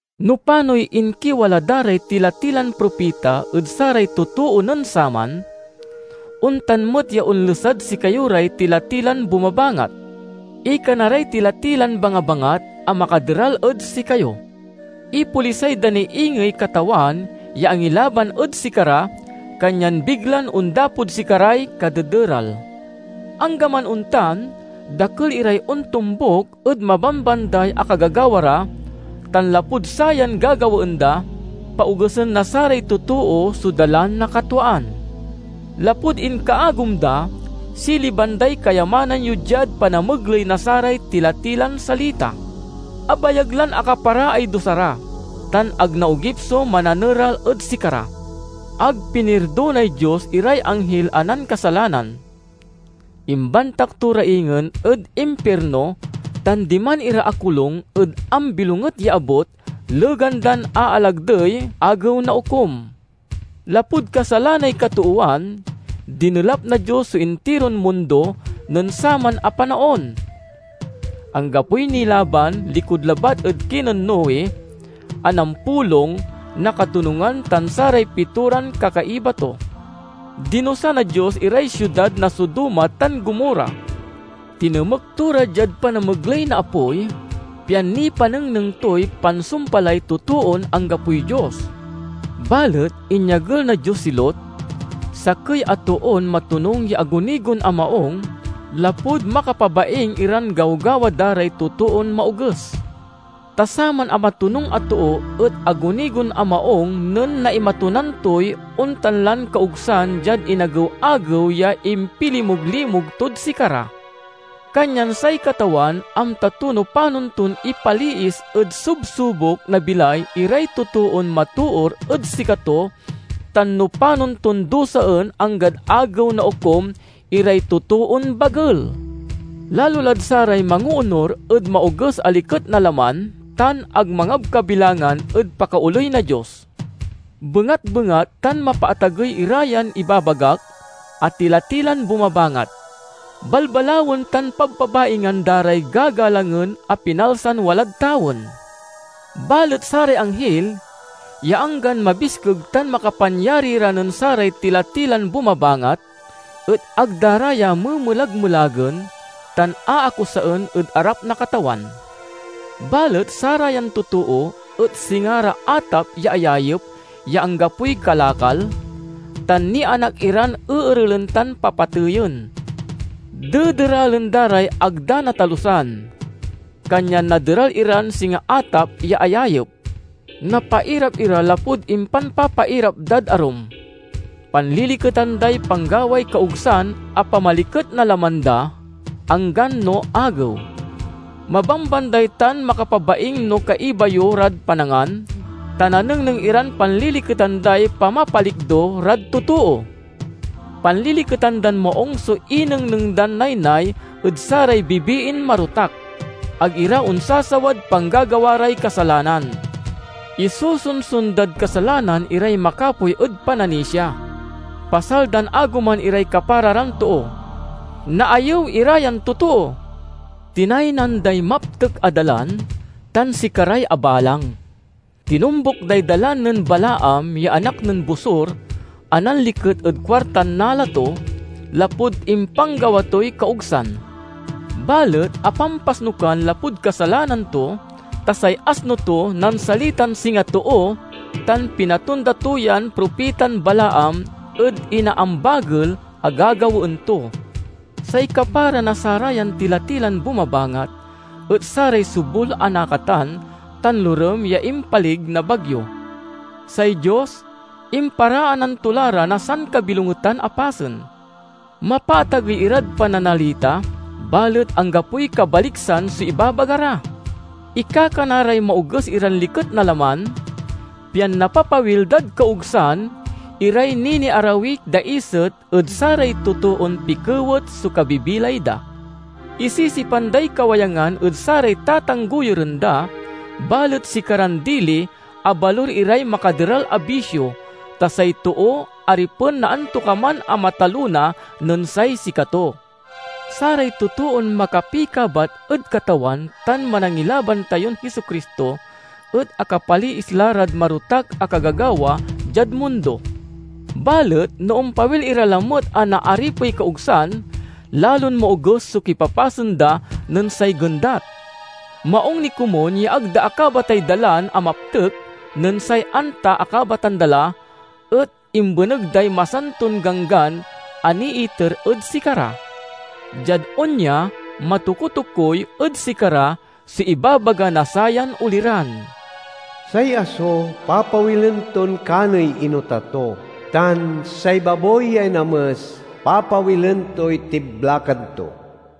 No panoy inkiwala da ray tila-tilan propita ed saray totoo nen saman, ontan met ya onlesad sikayo ray tila-tilan bumabangat. Ikana ray tila-tilan bangabangat a makaderal ed sikayo. Ipolisay da ni ingey Katawan ya angilaban ed sikara, kanyan biglan ondapod sikaray kadederal. Anggaman ontan, dakel iray ontombuk ed mabambanday a kagagawa ra; tan lapud sayan gagawaen da, paogesen na saray totoo so Dalan na katwaan. Lapud inkaagom da, siliban day kayamanan yo diad panamegley na saray tila-tilan salita. Abayag lan akaparaay dusa ra, tan ag naogip so Mananeral ed sikara! Ag pinirdonay Dios iray anghil a nankasalanan; imbantak to ra ingen ed impirno tan diman ira akolung ed ambilonget ya abut legan dan aalagdey Agew na Okum. Lapud kasalanay katoowan, dinelap na Dios so intiron mundo nen saman a panaon. Anggapoy nilaban, likud labat ed kinen Noe a nampulong na katonungan tan saray pitoran kakaiba to. Dinusa na Dios iray siudad na Sodoma tan Gomorra. Tinemek to ra diad panamegley na apoy, pian nipanengneng toy pansumpalay totoon anggapoy Dios. Balet inyagel na Dios si Lot, sakey a toon matonung ya agunigon a maung lapud makapabaing iran gawgawa da ray totoon maoges. Ta saman a matonung a too et agunigon a maung nen naimatunan toy ontan lan kaogsan diad inagew-agew ya impilimuglimug tod sikara. Kanyan say Katawan amta to no panon ton ipaliis ed subsubok na bilay iray totoon matoor ed sikato tan no panon ton dusaen anggad Agew na Okum iray totoon bagel, lalo lad saray mangoonur ed maoges a liket na laman tan ag mangabkabilangan ed pakaoley na Dios. Bengatbengat tan mapaatagey ira yan ibabagak a tila-tilan bumabangat. Balbalawen tan pabpabaingan da ray gagalangen a pinalsan walad tawen. Balet saray anghil, ya anggan mabiskeg tan makapanyari ra nen saray tila-tilan bumabangat, et ag da ra ya memelagmelagen tan aakusaen ed arap na Katawan. Balet sarayan totoo et singa ra atap ya ayayep ya anggapoy kalakal, tan nianak iran eerelen tan papateyen. Dederalen da ray ag da natalusan. Kanyan naderal iran singa atap ya ayayep. Napairap ira lapud impanpapairap dad arum. Panliliketan day panggaway kaogsan a pamaliket na laman da, anggan no agew. Mabambanday tan makapabaing no kaiba yo rad panangan, ta nanengneng iran panliliketan day pamapalikdo rad totoo! Panliliketan dan maung so inengneng dan naynay ed saray bibiin marotak. Ag ira onsasawad panggagawa ray kasalanan. Isosonson dad kasalanan iray makapoy ed pananisia. Pasal dan agoman iray kapara ran too. Naayew ira yan totoo! Tinaynan day maptek a dalan tan sikaray abalang; tinombuk day dalan nen Balaam ya anak nen Bosor a nanliket ed kuartan nala to, lapud impanggawa toy kaogsan. Balet apampasnukan lapud kasalanan to, ta say asno to nansalitan singa too tan pinatonda to yan propitan Balaam ed inaambagel a gagawaen to. Say kapara na sarayan tila-tilan bumabangat et saray sobul a nakatan tan lorem ya impalig na bagyo. Say Dios imparaanan to la ra na sankabilongetan a pasen. Mapaatagey irad pananalita, balet anggapoy kabaliksan so ibabaga ra. Ikakana ray maoges iran liket na laman, pian napapawil dad kaogsan iray niniarawiy daiset ed saray totoon pikewet so kabibilay da. Isisipan day kawayangan ed saray tatanggoyuren da, balet sikaran dili abalur iray makaderal a bisio—ta say too aripen na antokaman a matalona nen say sikato. Saray totoon makapikabat ed Katawan tan Manangilaban tayon Jesu-Cristo et akapaliis la rad marotak a kagagawa diad mundo. Balet no ompawil ira lamet a naaripey kaogsan, lalon maoges so kipapasen da nen say gendat. Maung ni komun ya ag da akabatay dalan a maptek nen say, anta akabatan da la, et imbeneg day masanton ganggan a niiter ed sikara. Diad onya, matokutokuy ed sikara so ibabaga na sayan oliran, "Say aso papawilen ton kaney inota to," tan, "Say baboy ya inames papawilen toy tiblakan to."